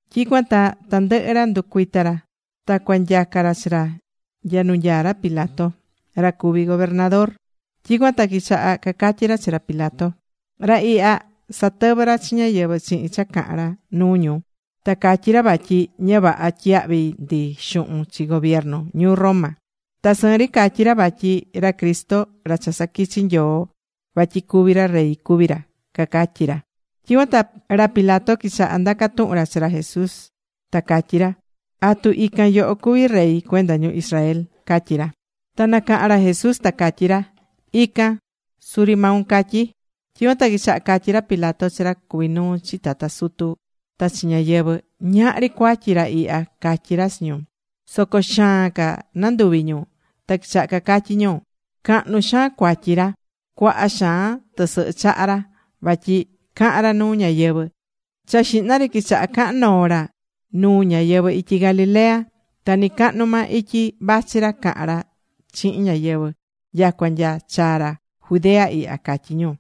Tyicuan ta tandɨhɨ ra nducuita̱ ra. Ta cua nyaca ra chi ra nya nu nyaá ra Pilato, ra cuví gobernador. Tyicuan ta quichaha cacatyi ra chi ra Pilato: ―Ra ihya, satɨvɨ́ ra chi ñáyɨvɨ chihin cha cahán ra nuu ñu, ta catyí ra vatyi ña vaha tyiyahvi ndi xuhun chi gobiernu ñuu Roma. Ta sɨɨn ri catyí ra vatyi ra Cristo ra cha saquichi Nyoo vatyi cuvi ra rey cuví ra ―cacatyí ra. Tyicuan ta ra Pilato quichaha ndaca tuhun ra chi ra Jesús, ta catyí ra: ―¿Atu ican yoho cuví Rey cuenda ñu Israel? ―catyí ra. Ta nacahan ra Jesús, ta catyí ra: ―Ican, suri maun catyí. Tyicuan ta quichaha catyí ra Pilato chi ra cuví nuu chi tata sutu ta chi ñáyɨvɨ: ―Ñahri cuatyi ra ihya ―catyí ra chi ñu. Soco xaan ca nanduvi̱ ñu. Ta quichaha cacatyí ñu: ―Cahnu xaan cuatyi ra. Cuaha xaan tɨsɨhɨ chaha̱ ra, vatyi cahán ra nuu ñáyɨvɨ. Cha xihna ri quichaha cahan noo ra nuu ñáyɨvɨ ityi Galilea. Ta nɨcañi maa ityi vachi ra cahán ra chihin ñáyɨvɨ nyacua nya chaa̱ ra Judea ihya ―catyí ñu.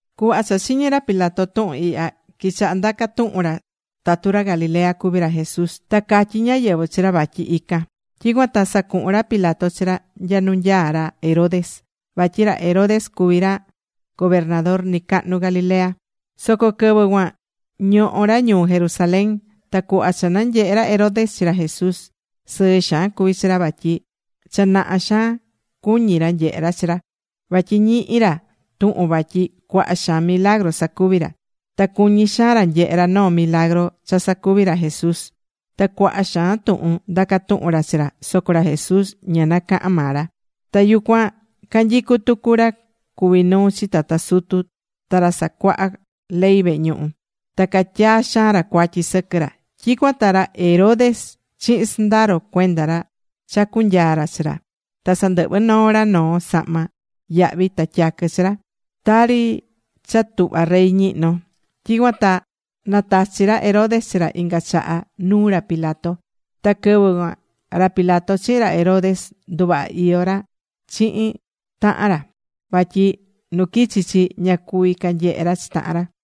Cuhva cha chiñi̱ ra Pilato tuhun ihya, quichaha ndaca tuhun ra tatu ra Galilea cuví ra Jesús. Ta catyí ñáyɨvɨ chi ra vatyi ican. Tyicuan ta sacuhu̱n ra Pilato chi ra nya nu nyaá ra Herodes. Vatyi ra Herodes cuví ra gobernador nɨcahnu Galilea. Soco quɨvɨ cuan ñohó ra ñuu Jerusalén. Ta cuhva cha nanyehe̱ ra Herodes chi ra Jesús, sɨɨ xaan cuví chi ra. Vatyi cha naha xaan cuñí ra nyehe ra chi ra. Vatyi ñihi̱ ra tuhun vatyi cuaha xaan milagru sacuví ra. Ta cuñí xaan ra nyehe ra noo milagru cha sacuví ra Jesús. Ta cuaha xaan tuhun ndaca̱ tuhun ra chi ra. Soco ra Jesús ña nacaha̱n maa ra. Ta yucuan canyicú tucu ra cuví nuu chi tata sutu ta ra casacuahá ley vehe ñuhu. Ta catyaa̱ xaan ra cuatyi sɨquɨ ra. Tyicuan ta ra Herodes chihin sɨndaro cuenda ra chacu̱ nyaa ra chi ra. Ta sandɨhvɨ̱ noo ra noo sahma yahvi ta tyaquɨ chi ra, tari cha tuhvá rey ñihnó. Tyicuan ta natachi̱ ra Herodes chi ra inga chaha nuu ra Pilato. Ta quɨvɨ cuan ra Pilato chihin ra Herodes nduvaha iyó ra chihin tahan ra. Vatyi nu quichi chi, ña cuví canyehe ra chi tahan ra.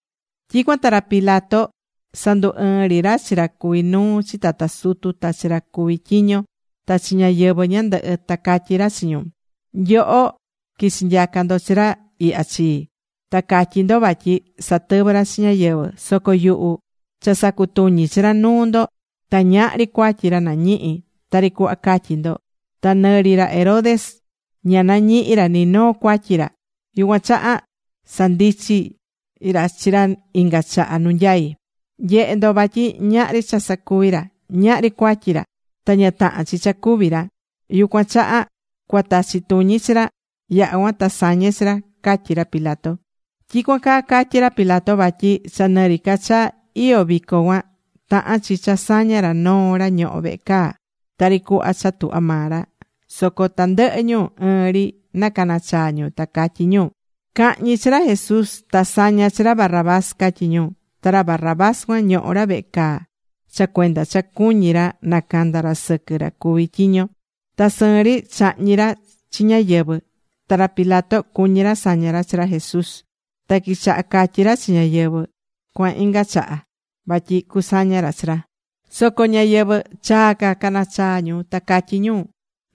Tyicuan ta ra Pilato sandu ɨɨ̱n ri ra chi ra cuví nuu chi tata sutu, ta chi ra cuví tyiño, ta chi ñáyɨvɨ ñandɨhɨ. Ta catyí ra chi ñu: ―Nyoho quichi̱ nyaca ndo chi ra ihya chii. Ta catyí ndo vatyi satɨvɨ́ ra chi ñáyɨvɨ. Soco yuhu cha sacutuñi̱ chi ra nuu ndo. Ta ñahri cuatyi ra nañihi̱ tari cuhva catyí ndo. Ta nɨ ri ra Herodes ña nañihi̱ ra ni noo cuatyi ra. Yucuan chaha sandichi̱ ra chi ra inga chaha nu nyai. Nye̱he ndo vatyi ñahri cha sacuví ra, ñahri cuatyi ra. Ta ña tahán chi cha cúvi ra. Yucuan chaha cua tachi tuñi ri chi ra. Yaha̱ cuan ta sañe chi ra ―catyí ra Pilato. Tyicuan caa catyí ra Pilato vatyi cha nɨ ri ca cha iyó vico cuan, tahán chi cha saña ra noo ra ñohó vehe caa, tari cuhva cha tuhva maa ra. Soco tandɨhɨ ñu ɨɨn ri nacanachaa ñu, ta catyí ñu: ―Ca̱hñi chi ra Jesús. Ta sa̱ña chi ra Barrabás ―catyí ñu. Ta ra Barrabás cuan ñohó ra vehe caa cha cuenda cha cuñí ra nacanda ra sɨquɨ ra cuví tyiño. Ta sɨɨn ri chahñi̱ ra chi ñáyɨvɨ. Ta ra Pilato cuñí ra saña ra chi ra Jesús. Ta quichaha catyí ra chi ñáyɨvɨ cuan inga chaha vatyi cusaña ra chi ra. Soco ñáyɨvɨ chaa ca caná chaa ñu, ta catyí ñu: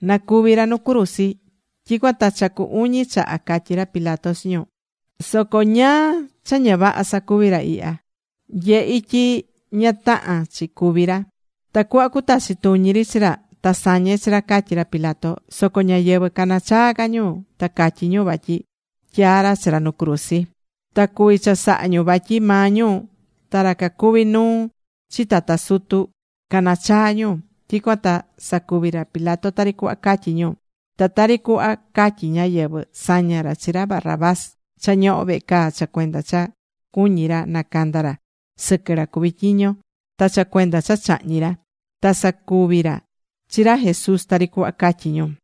―Na cúvi ra nu cruzi. Tyicuan ta cha cu uñi chaha catyí ra Pilato chi ñu: ―Soco ¿ñáá cha ña vaha sacuvi̱ ra ihya? Nyehi̱ tyi ña tahán chi cúvi ra. Tacuhva cutachi tuñi ri chi ra, ta sañe chi ra ―catyí ra Pilato. Soco ñáyɨvɨ caná chaa ca ñu, ta catyí ñu vatyi tyaa ra chi ra nu cruzi. Ta cuví chasaha ñu. Vatyi maa ñu ta ra cacuví nuu chi tata sutu caná chaa ñu. Tyicuan ta sacuvi̱ ra Pilato tari cuhva catyí ñu. Ta tari cuhva catyí ñáyɨvɨ, saña̱ ra chi ra Barrabás cha ñohó vehe caa cha cuenda cha cuñí ra nacanda ra sɨquɨ ra cuví tyiño ta cha cuenda cha chahñi̱ ra. Ta sacuvi̱ ra chi ra Jesús tari cuhva catyí ñu.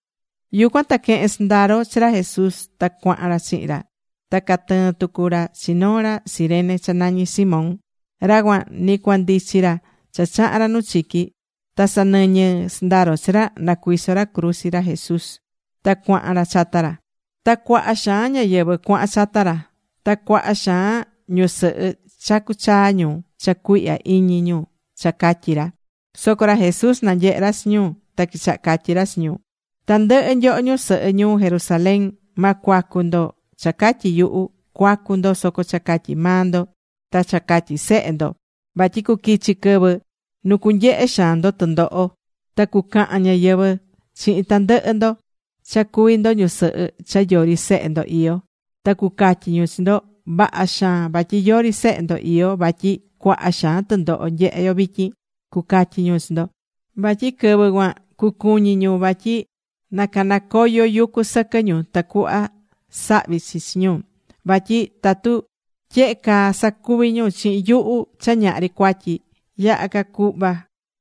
Yucuan ta quehe̱n sɨndaro chi ra Jesús. Ta cuahan ra chihin ra. Ta catɨɨ̱n tucu ra chi noo ra Cirene cha nañí Simón. Ra cuan ni cua ndichi ra cha chaha̱n ra nu chiqui. Ta sanɨñɨ sɨndaro chi ra, na cuiso ra cruzi ra Jesús ta cuahan ra chata ra. Ta cuaha xaan ñáyɨvɨ cuahan chata ra. Ta cuaha xaan ñusɨhɨ chacú chaa ñu cha cuihya iñi ñu cha catyí ra. Soco ra Jesús nanyehe̱ ra chi ñu. Ta quichaha catyi ra chi ñu: ―Tandɨhɨ nyoho ñusɨhɨ ñuu Jerusalén, ma cuacu ndo cha catyi yuhu. Cua̱cu ndo, soco cha catyi maa ndo ta cha catyi sehe ndo. Vatyi cuquichi quɨvɨ nu cunyehe xaan ndo tundoho. Ta cucahan ñáyɨvɨ chihin tandɨhɨ ndo cha cuví ndo ñusɨhɨ cha yori sehe ndo iyó. Ta cucatyi ñu chi ndo: “Vaha xaan vatyi yori sehe ndo iyó vatyi cuaha xaan tundoho nyehé yo vityin”, cucatyi ñu chi ndo. Vatyi quɨvɨ cuan cucuñí ñu vatyi na canacoyo yucu sɨquɨ ñu tacuhva sahvi chi chi ñu. Vatyi tatu tyehe caa sacuvi ñu chihin yuhu cha ñahri cuatyi. Yaha ca cuhva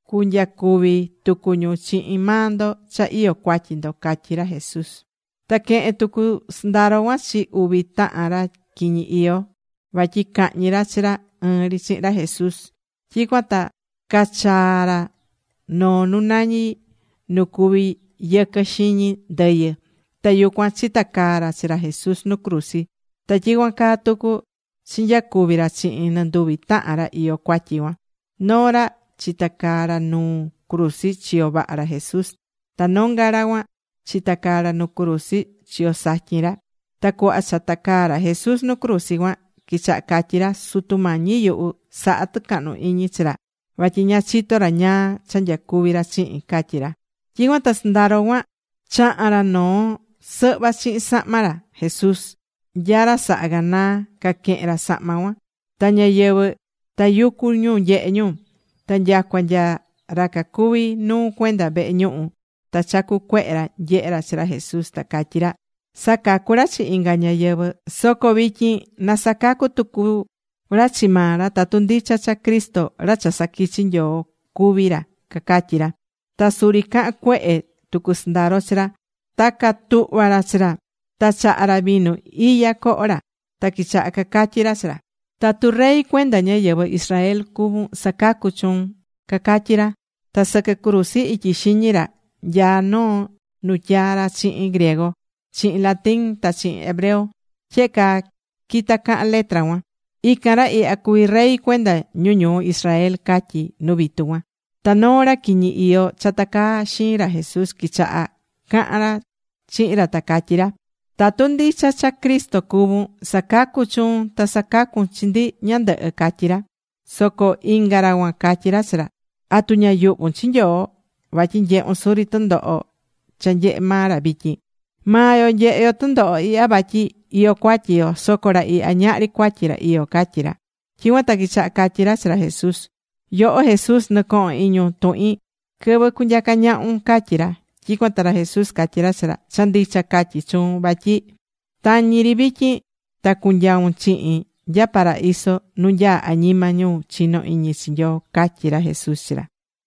cunyacuvi tucu ñu chihin maa ndo cha iyó cuatyi ndo ―catyí ra Jesús. Ta quehe̱n tucu sɨndaro cuan chi uvi tahan ra quiñi iyó, vatyi cahñi ra chi ra ɨɨn ri chihin ra Jesús. Tyicuan ta cachaa̱ ra noo nu nañi Nu Cuví Yɨquɨ Xiñi Ndɨyɨ. Ta yucuan chicatacaa̱ ra chi ra Jesús nu cruzi. Ta tyicuan caa tucu chinyacuvi̱ ra chihin nɨnduvi tahan ra iyó cuatyi cuan. Noo ra chitacaá ra nuu cruzi chiyo vaha ra Jesús. Ta nonga ra cuan chitacaá ra nuu cruzi chiyo satyin ra. Ta cuhva cha tacaá ra Jesús nu cruzi cuan, quichaha catyi ra: ―Sutu Mañi yuhu, sa̱ha tucahnu iñi chi ra. Vatyi ña chitó ra ñáá cha nyacuví ra chihin ―catyí ra. Tyicuan ta sɨndaro cuan chaha̱n ra noo sɨhva chihin sahma ra Jesús. Nya ra saha ganaa caquehen ra sahma cuan. Ta ñáyɨvɨ tayucú ñu nyehé ñu. Ta nyacua nya ra cacuví nuu cuenda vehe ñuhu, ta chacú cuehe ra nyehé ra chi ra Jesús. Ta catyí ra: ―Sacacu̱ ra chi inga ñáyɨvɨ. Soco vityin na sacacu tucu ra chi maa ra, tatu ndicha cha Cristo, ra cha saquichi Nyoo, cuví ra ―cacatyí ra. Ta suri cahán cuehe tucu sɨndaro chi ra. Ta catuhva̱ ra chi ra. Ta chaha̱ ra vinu iya coho ra. Ta quichaha cacatyi ra chi ra: ―Tatu rey cuenda ñáyɨvɨ Israel cuvún. Sa̱cacu chuun ―cacatyí ra. Ta sɨquɨ cruzi ityi xiñi ra nyaá noo nu tyaa̱ ra chihin griego, chihin latín, ta chihin hebreo. Tyehe caa quita cahán letra cuan: “Ican ra ihya cuví Rey cuenda ñu ñuu Israel” ―catyí nu vitu cuan. Ta noo ra quiñi iyó cha tacaá xiin ra Jesús, quichaha cahan ra chihin ra, ta catyí ra: ―Tatu ndicha cha Cristo cuvún, sa̱cacu chuun. Ta sa̱cacu chi ndi ñandɨhɨ ―catyí ra. Soco inga ra cuan catyí ra chi ra: ―¿Atu ña yuhvún chi Nyoo? Vatyi nyehún suri tundoho cha nyehé maa ra vityin. Maa yo nyehé yo tundoho ihya vatyi iyó cuatyi yo. Soco ra ihya ñahri cuatyi ra iyó ―catyí ra. Tyicuan ta quichaha catyí ra chi ra Jesús: ―Yoho Jesús, nɨ̱cohon iñun tuhin quɨvɨ cunyaca ñahun ―catyí ra. Tyicuan ta ra Jesús catyí ra chi ra: ―Cha ndicha catyí chuun vatyi tañi ri vityin ta cunyaun chihin nya paraíso nu nyaá añima ñu chinó iñi chi Nyoo ―catyí ra Jesús chi ra.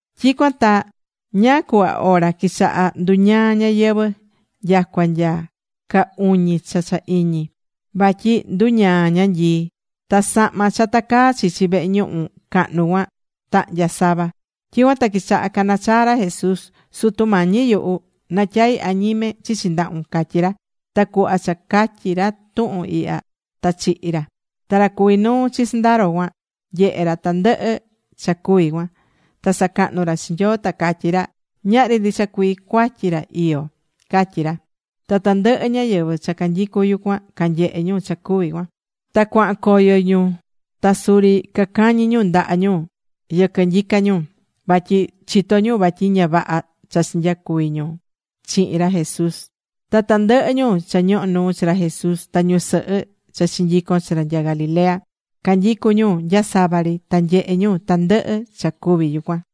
Tyicuan ta ñáá cuhva ora quichaha nduñaa ñayɨvɨ̱, nyacua nya caa uñi cha cha iñi. Vatyi nduñaa ñanyii. Ta sahma cha tacaá chichi vehe ñuhu cahnu cuan, tahnya̱ sava. Tyicuan ta quichaha cana chaa ra Jesús: ―Sutu Mañi yuhu, natyaí añime chichi ndahun ―catyí ra. Ta cuhva cha catyi̱ ra tuhun ihya, ta chihi̱ ra. Ta ra cuví nuu chi sɨndaro cuan, nyehe̱ ra tandɨhɨ cha cuvi̱ cuan. Ta sacahnú ra chi Nyoo, ta catyí ra: ―Ñahri ndicha cuii cuatyi ra iyó ―catyí ra. Ta tandɨhɨ ñáyɨvɨ cha canyicú yucuan canyehe̱ ñu cha cuvi̱ cuan. Ta cuahan coyo ñu ta suri cacañí ñu ndaha ñu yɨquɨ nyica ñu. Vatyi chitó ñu vatyi ña vaha cha chinyacuvi̱ ñu chihin ra Jesús. Ta tandɨhɨ ñu cha ñohó nuu chi ra Jesús, ta ñusɨhɨ cha chinyico̱n chi ra nya Galilea, canyicú ñu nya sava ri. Ta nyehe̱ ñu tandɨhɨ cha cuvi̱ yucuan.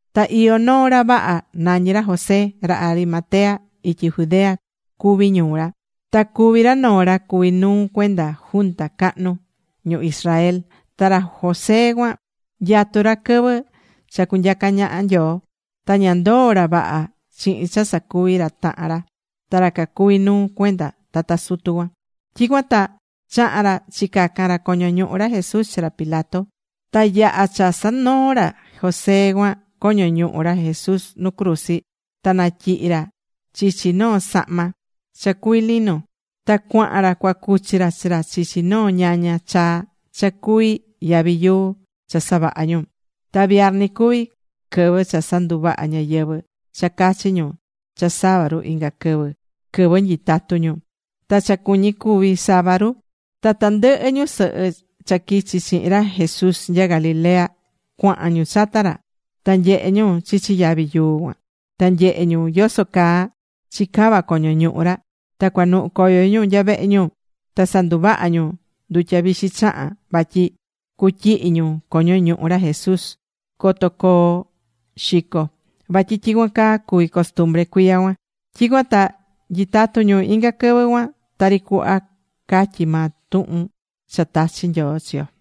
Ta iyó noo ra vaha, nañí ra José. Ta Arimatea ityi Judea cuví ñuu ra. Ta cuví ra noo ra cuví nuu cuenda Junta Cahnu ñu Israel. Ta ra José cuan nyatú ra quɨvɨ cha cunyaca ñaha Nyoo. Ta ña ndoo̱ ra vaha chihin cha sacuvi̱ ra tahan ra, ra cacuví nuu cuenda tata sutu cuan. Tyicuan ta chaha̱n ra chicacan ra coño ñuhu ra Jesús chi ra Pilato. Ta yaha̱ cha sanoo̱ ra José cuan coño ñuhu ra Jesús nu cruzi, ta natyihi̱ ra chichi noo sahma cha cuví lino. Ta cuahan ra cua cuchi ra chi ra chichi noo ñaña chaa cha cuví yavi yuu cha savaha̱ ñu. Ta viarni cuví, quɨvɨ cha sanduvahá ñáyɨvɨ cha cachi ñu cha sabaru inga quɨvɨ, quɨvɨ nyitatu ñu. Ta cha cuñí cuví sabaru. Ta tandɨhɨ ñusɨhɨ cha quichi chihin ra Jesús nya Galilea, cuahan ñu chata ra. Ta nyehe̱ ñu chichi yavi yuu cuan. Ta nyehe̱ ñu yoso caa chicava coño ñuhu ra. Ta cuanuhu coyo ñu nya vehe ñu. Ta sanduvaha̱ ñu ndutya vixi chahán vatyi cutyihi ñu coño ñuhu ra Jesús coto coo xico. Vatyi tyicuan caa cuví costumbre cuiya cuan. Tyicuan ta nyitatú ñu inga quɨvɨ cuan tari cuhva catyí maa tuhun cha tachi̱ Nyoo chi yo.